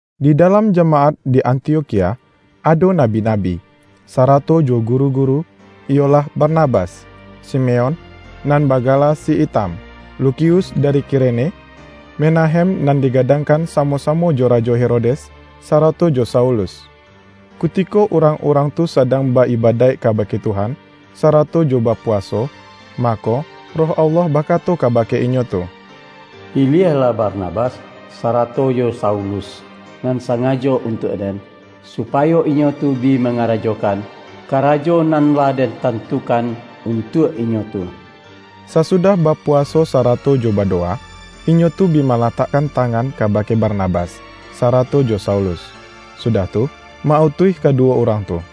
Di dalam jamaat di Antiokhia, ado nabi-nabi, sarato jo guru-guru, iyolah Barnabas, Simeon, nan bagala si Itam, Lukius dari Kirene, Menahem nan digadangkan samo-samo jo Rajo Herodes, sarato jo Saulus. Kutiko urang-urang tu sadang ba-ibadaik kabake Tuhan, sarato jo bapuwaso, mako, Roh Allah bakato kabake inyo tu,”Piliahlah Barnabas, sarato jo Saulus, nan sangajo untuak Den, supayo inyo tu bi mangarajokan, karajo nan lah Den tantukan untuak inyo tu.” Sasudah bapuwaso sarato jo badowa, inyo tu bi malatakkan tangan kabake Barnabas, sarato jo Saulus, sudah tu, ma-utuih kaduwo urang tu.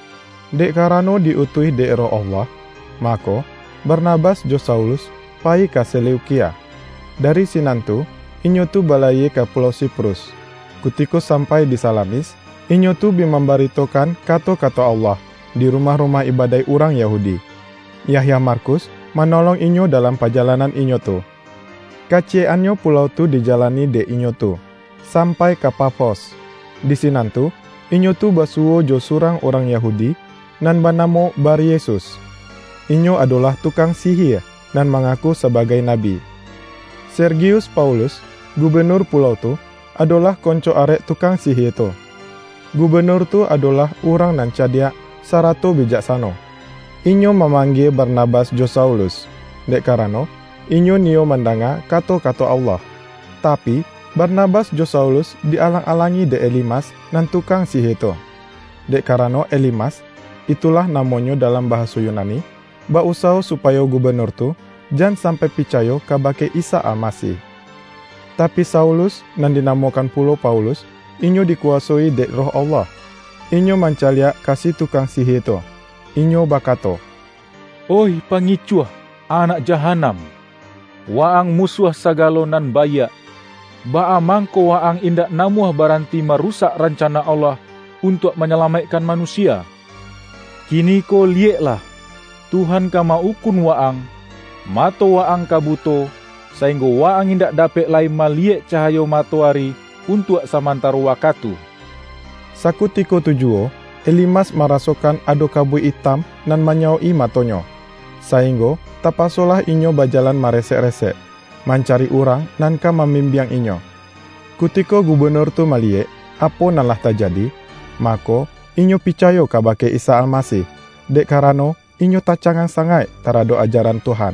Dek karano di-utuih dek Roh Allah, mako, Barnabas jo Saulus payi ka Seleukia. Dari sinan tu inyo tu balayie ka pulau Siprus. Kutiko sampai di Salamis, inyo tu bi mambaritokan kato-kato Allah, di rumah-rumah ibadaik urang Yahudi.Yahya Markus manolong inyo dalam pajalanan inyo tu. Kaciyek-annyo pulau tu dijalani dek inyo tu, sampai ka Pafos. Di sinan tu, inyo tu basuwo jo surang urang Yahudi, nan banamo Baryesus. Inyo adolah tukang sihie, nan mangaku sabagai nabi. Sergius Paulus, gubenur pulau tu, adolah konco arek tukang sihie tu. Gubenur tu adolah urang nan cadiak sarato bijaksano. Inyo mamanggie Barnabas jo Saulus, dek karano inyo niyo mandanga kato-kato Allah. Tapi, Barnabas jo Saulus, di-alang-alangi dek Elimas nan tukang sihie tu, dek karano Elimas, (itulah namonyo dalam bahaso Yunani) ba-usawo supayo gubenur tu, jan sampai picayo kabake Isa Almasih. Tapi Saulus — nan dinamokan pulo Paulus, — inyo dikuwasoi dek Roh Allah, inyo mancaliak ka si tukang sihie tu, inyo bakato,”Oih pangicuah, anakjahanam! Wa-ang musuah sagalo nan baiak. Baa mangko wa-ang indak namuah baranti marusak rancana Allah untuak manyalamaikkan manusia? Kiniko liyeklah, Tuhan ka ma-ukun wa-ang! Mato wa-ang ka buto, sainggo wa-ang indak dapek lai maliyek cahayo matoari untuak samantaro wakatu.” Sakutiko tu juwo, Elimas marasokan ado kabuik itam nan manyawok-i matonyo, sainggo tapasolah inyo bajalan maresek-resek, mancari urang nan ka mambimbiang inyo. Kutiko gubenur tu maliyek, apo nan lah tajadi, mako, inyo picayo kabake Isa Almasih; dek karano, inyo tacangang sangaik taradok ajaran Tuhan.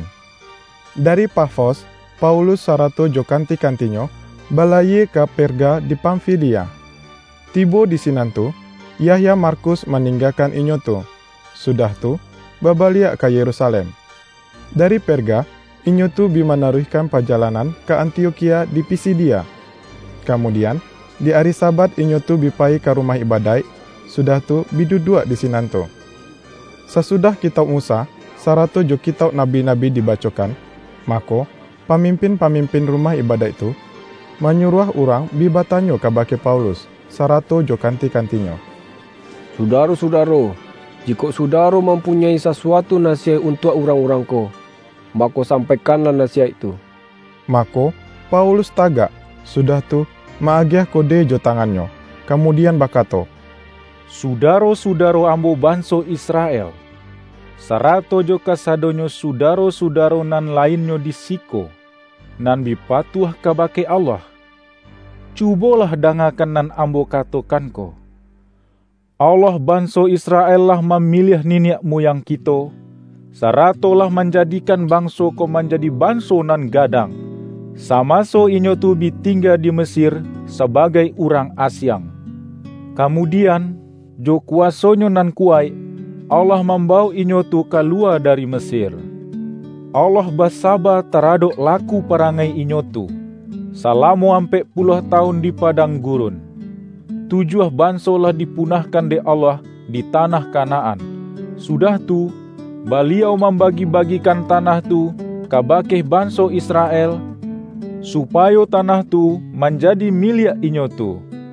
Dari Pafos, Paulus sarato jo kanti-kantinyo, balayie ka Perga di Pamfilia. Tibo di sinan tu, Yahya Markus maninggakan inyo tu, sudah tu, babaliak ka Yerusalem. Dari Perga, inyo tu bi manaruihkan pajalanan ka Antiokhia di Pisidia, kamudian, di ari Sabat, inyo tu bi payi ka rumah ibadaik, sudah tu, bi duduak di sinan tu. Sasudah Kitauk Musa, sarato jo Kitauk Nabi-nabi dibacokan, mako, pamimpin-pamimpin rumah ibadaik tu, manyuruah urang bi batanyo kabake Paulus, sarato jo kanti-kantinyo,”Sudaro-sudaro, jikok sudaro mampunyoi sasuatu nasiyaik untuak urang-urang ko, mako, sampaikanlah nasiyaik tu.” Mako, Paulus tagak, sudah tu, ma-agiah kode jo tangannyo, kamudian bakato,”Sudaro-sudaro ambo banso Israel, sarato jo kasadonyo sudaro-sudaro nan lainnyo di siko, nan bi patuah kabake Allah! Cubolah dangakan nan ambo katokan ko: Allah banso Israel lah mamiliah niniak muyang kito, sarato lah manjadikan banso ko manjadi banso nan gadang, samaso inyo tu bi tingga di Mesir sabagai urang asiang. Kamudian, jo kuwaso-Nyo nan kuwaik, Allah mambawok inyo tu kaluwa dari Mesir. Allah basaba taradok laku parangai inyo tu, salamo ampek puluah tawun di padang gurun. Tujuah banso lah dipunahkan dek Allah di tanah Kanaan. Sudah tu, Baliau mambagi-bagikan tanah tu kabake banso Israel, supayo tanah tu manjadi miliak inyo tu.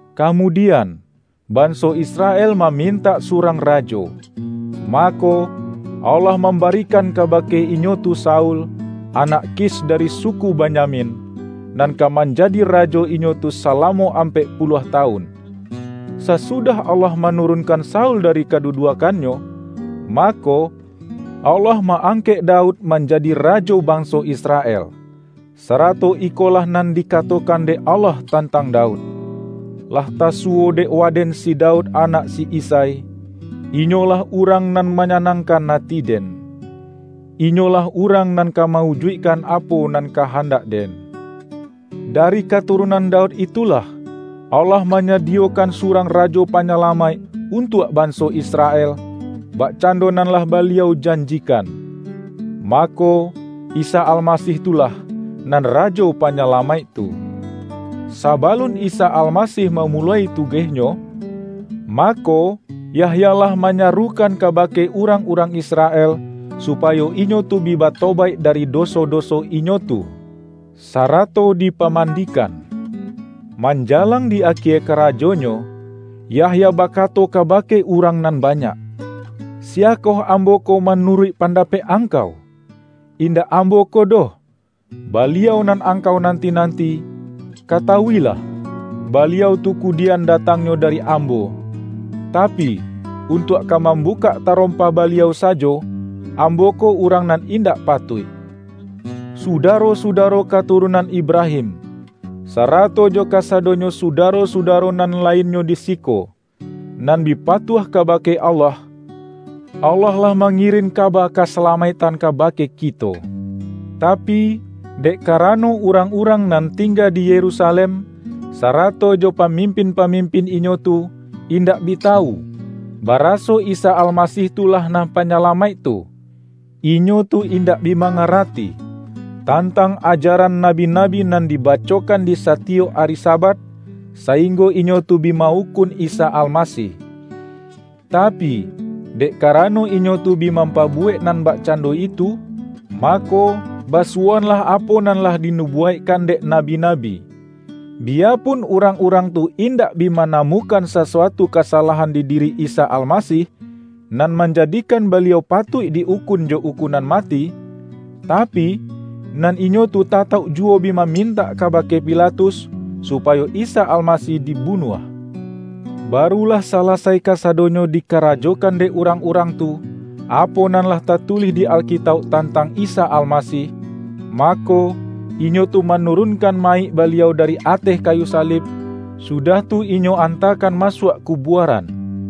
Kamudian, banso Israel mamintak surang rajo. Mako, Allah mambarikan kabake inyo tu Saul, anak Kis dari suku Benyamin, nan ka manjadi rajo inyo tu salamo ampek puluah tawun. Sasudah Allah manurunkan Saul dari kaduduakkannyo, mako, Allah ma-angkek Daud manjadi rajo banso Israel. Sarato ikolah nan dikatokan dek Allah tantang Daud, ’Lah tasuwo dek Waden si Daud anak si Isai, inyo lah urang nan manyanangkan ati Den. Inyolah urang nan ka ma-ujuikkan apo nan kahandak-Den.’ Dari katurunan Daud itulah, Allah manyadiyokan surang Rajo Panyalamaik untuak banso Israel, bakcando nan lah Baliau janjikan. Mako, Isa Almasih tu lah, nan Rajo Panyalamaik tu. Sabalun Isa Almasih mamuloi tugeh-Nyo, mako, Yahya lah manyarukan kabake urang-urang Israel, supayo inyo tu bi batobaik dari doso-doso inyo tu, sarato dipamandikan. Manjalang di akie karajonyo, Yahya bakato kabake urang nan banyak, ’Siyakoh ambo ko manuruik pandapek angkau? Indak ambo ko doh, Baliau nan angkau nanti-nanti. Katawuilah, Baliau tu kudian datangnyo dari ambo; tapi, untuak ka mambukak tarompa Baliau sajo, ambo ko urang nan indak patuik.’ Sudaro-sudaro katurunan Ibrahim, sarato jo kasadonyo Sudaro-sudaro nan lainnyo di siko, nan bi patuah kabake Allah! Allah lah mangirin kaba kasalamaiktan kabake kito; tapi, dek karano urang-urang nan tingga di Yerusalem, sarato jo pamimpin-pamimpin inyo tu, indak bi tawu, baraso Isa Almasih tu lah nan Panyalamaik tu. Inyo tu indak bi mangarati, tantang ajaran nabi-nabi nan dibacokan di satiyok ari Sabat, sainggo inyo tu bi ma-ukun Isa Almasih. Tapi, dek karano inyo tu bi mampabuwek nan bakcando itu, mako, basuwoanlah apo nan lah dinubuwaikkan dek nabi-nabi. Biyapun urang-urang tu indak bi manamukan sasuatu kasalahan di diri Isa Almasih, nan manjadikan Baliau patuik di-ukun jo ukunan mati, tapi, nan inyo tu tatauk juwo bi mamintak kabake Pilatus, supayo Isa Almasih dibunuah. Baru lah salasai kasadonyo dikarajokan dek urang-urang tu, apo nan lah tatulih di Alkitauk tantang Isa Almasih, mako, inyo tu manurunkan mayik Baliau dari ateh kayu salib, sudah tu inyo antakan masuak kubuaran.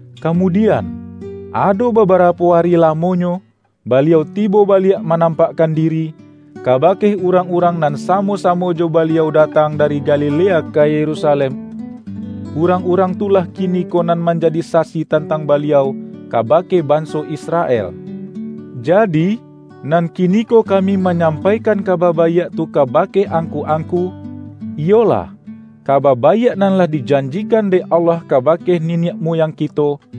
Kamudian, ado babarapo ari lamonyo, Baliau tibo baliak manampakkan diri, kabake urang-urang nan samo-samo jo Baliau datang dari Galilea ka Yerusalem. Urang-urang tu lah kiniko nan manjadi sasi tantang Baliau kabake banso Israel. Jadi, nan kiniko kami manyampaikan Kaba Baiak tu kabake angku-angku: Iyolah, Kaba Baiak nan lah dijanjikan dek Allah kabake niniak muyang kito,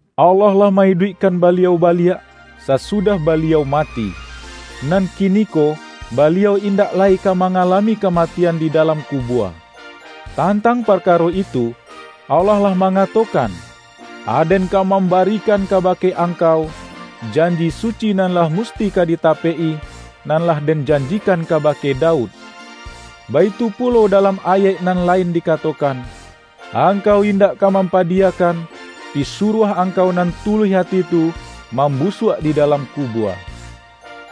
Allah lah ma-iduikkan Baliau baliak, sasudah Baliau mati. Nan kiniko Baliau indak lai ka mangalami kamatian di dalam kubua. Tantang parkaro itu, Allah lah mangatokan, ’Aden ka mambarikan kabake Angkau, janji suci nan lah musti ka ditapek-i, nan lah Den janjikan kabake Daud.’ Baitu pulo dalam ayaik nan lain dikatokan, ’Angkau indak ka mampadiyakan, Pisuruah Angkau nan tuluih ati tu, mambusuak di dalam kubua.’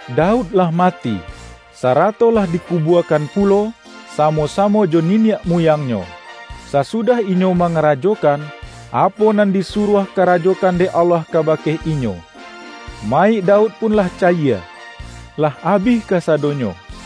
Daud lah mati, sarato lah dikubuakan pulo samo-samo jo niniak muyangnyo, sasudah inyo mangarajokan, apo nan disuruah karajokan dek Allah kabake inyo. Mayik Daud pun lah cayie, lah abih kasadonyo.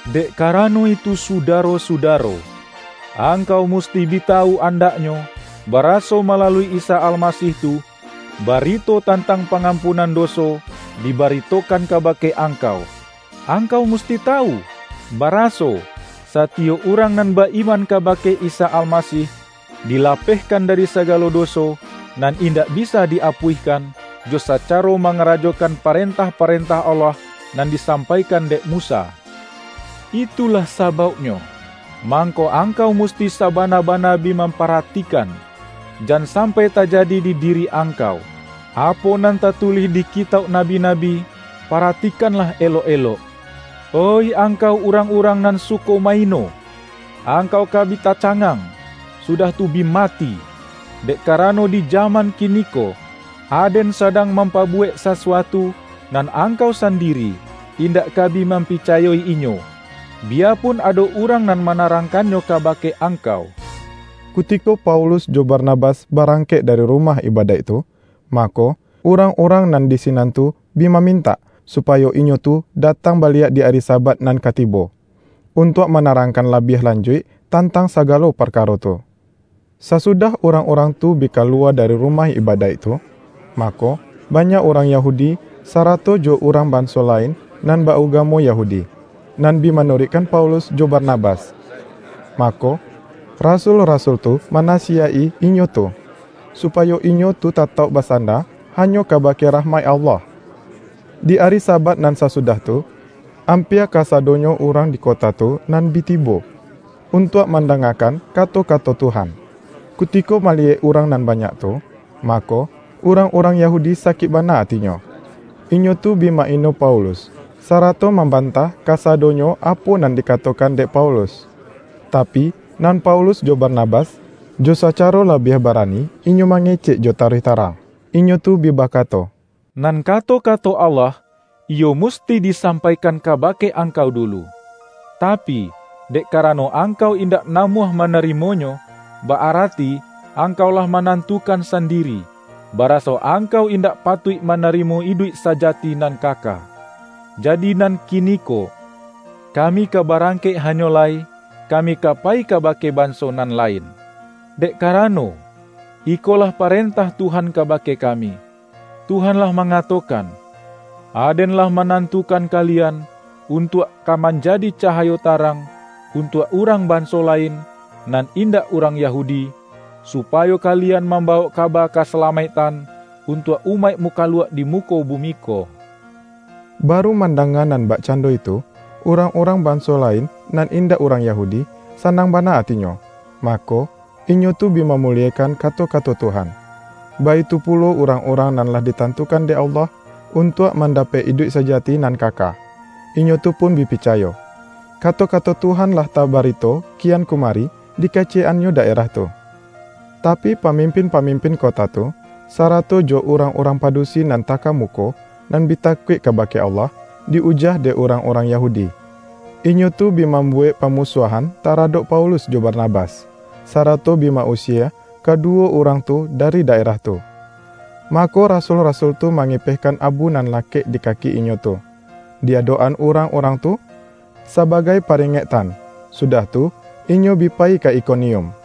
Dek karano itu Sudaro-sudaro, angkau musti bi tawu andaknyo, baraso malalui Isa Almasih tu, barito tantang pangampunan doso dibaritokan kabake angkau; angkau musti tawu, baraso, satiyok urang nan ba-iman kabake Isa Almasih, dilapehkan dari sagalo doso, nan indak bisa di-apuihkan, jo sacaro mangarajokan parentah-parentah Allah nan disampaikan dek Musa. Itulah sabauknyo, mangko angkau musti sabana-bana bi mamparatikan, jan sampai tajadi di diri angkau, apo nan tatulih di kitauk nabi-nabi, ’Paratikanlah elok-elok, oih angkau urang-urang nan suko ma-ino! Angkau ka bi tacangang, sudah tu bi mati! Dek karano di jaman kiniko, Aden sadang mampabuwek sasuatu, nan angkau sandiri, indak ka bi mampicayo-inyo, biyapun ado urang nan manarangkannyo kabake angkau.’” Kutiko Paulus jo Barnabas barangkek dari rumah ibadaik tu, mako, urang-urang nan di sinan tu bi mamintak, supayo inyo tu datang baliak di ari Sabat nan ka tibo, untuak manarangkan labiah lanjuik tantang sagalo parkaro tu. Sasudah urang-urang tu bi kaluwa dari rumah ibadaik tu, mako, banyak urang Yahudi, sarato jo urang banso lain nan ba-ugamo Yahudi, nan bi manuruikkan Paulus jo Barnabas. Mako, rasul-rasul tu manasiyaik-i inyo tu, supayo inyo tu tatauk basanda hanyo kabake rahmaik Allah. Di ari Sabat nan sasudah tu, ampia kasadonyo urang di kota tu nan bi tibo, untuak mandangakan kato-kato Tuhan. Kutiko maliyek urang nan banyak tu, mako, urang-urang Yahudi sakik bana atinyo. Inyo tu bi ma-ino Paulus, sarato mambantah kasadonyo apo nan dikatokan dek Paulus. Tapi, nan Paulus jo Barnabas, jo sacaro labiah barani inyo mangecek jo taruih tarang. Inyo tu bi bakato,”Nan kato-kato Allah, iyo musti disampaikan kabake angkau dulu. Tapi, dek karano angkau indak namuah manarimonyo, ba-arati angkau lah manantukan sandiri, baraso angkau indak patuik manarimo iduik sajati nan kaka. Jadi nan kiniko, kami ka barangkek hanyo lai, kami ka payi kabake banso nan lain. Dek karano, ikolah parentah Tuhan kabake kami; Tuhan lah mangatokan, ’Aden lah manantukan kalian, untuak ka manjadi cahayo tarang, untuak urang banso lain, nan indak urang Yahudi, supayo kalian mambawok kaba kasalamaiktan, untuak umaik mukaluak di muko bumi ko.’” Baru mandanga nan bakcando itu, urang-urang banso lain nan indak urang Yahudi, sanang bana atinyo, mako, inyo tu bi mamuliekan kato-kato Tuhan. Baitu pulo urang-urang nan lah ditantukan dek Allah, untuak mandapek iduik sajati nan kaka, inyo tu pun bi picayo. Kato-kato Tuhan lah tabarito kian kumari di kaciyek-annyo daerah tu. Tapi, pamimpin-pamimpin kota tu, sarato jo urang-urang padusi nan takamuko, nan bi takuik kabake Allah, di-ujah dek urang-urang Yahudi. Inyo tu bi mambuwek pamusuahan taradok Paulus jo Barnabas, sarato bi ma-usie kaduwo urang tu dari daerah tu. Mako, rasul-rasul tu mangipehkan abu nan lakek di kaki inyo tu, di adok-an urang-urang tu sabagai paringektan, sudah tu, inyo bi payi ka Ikonium.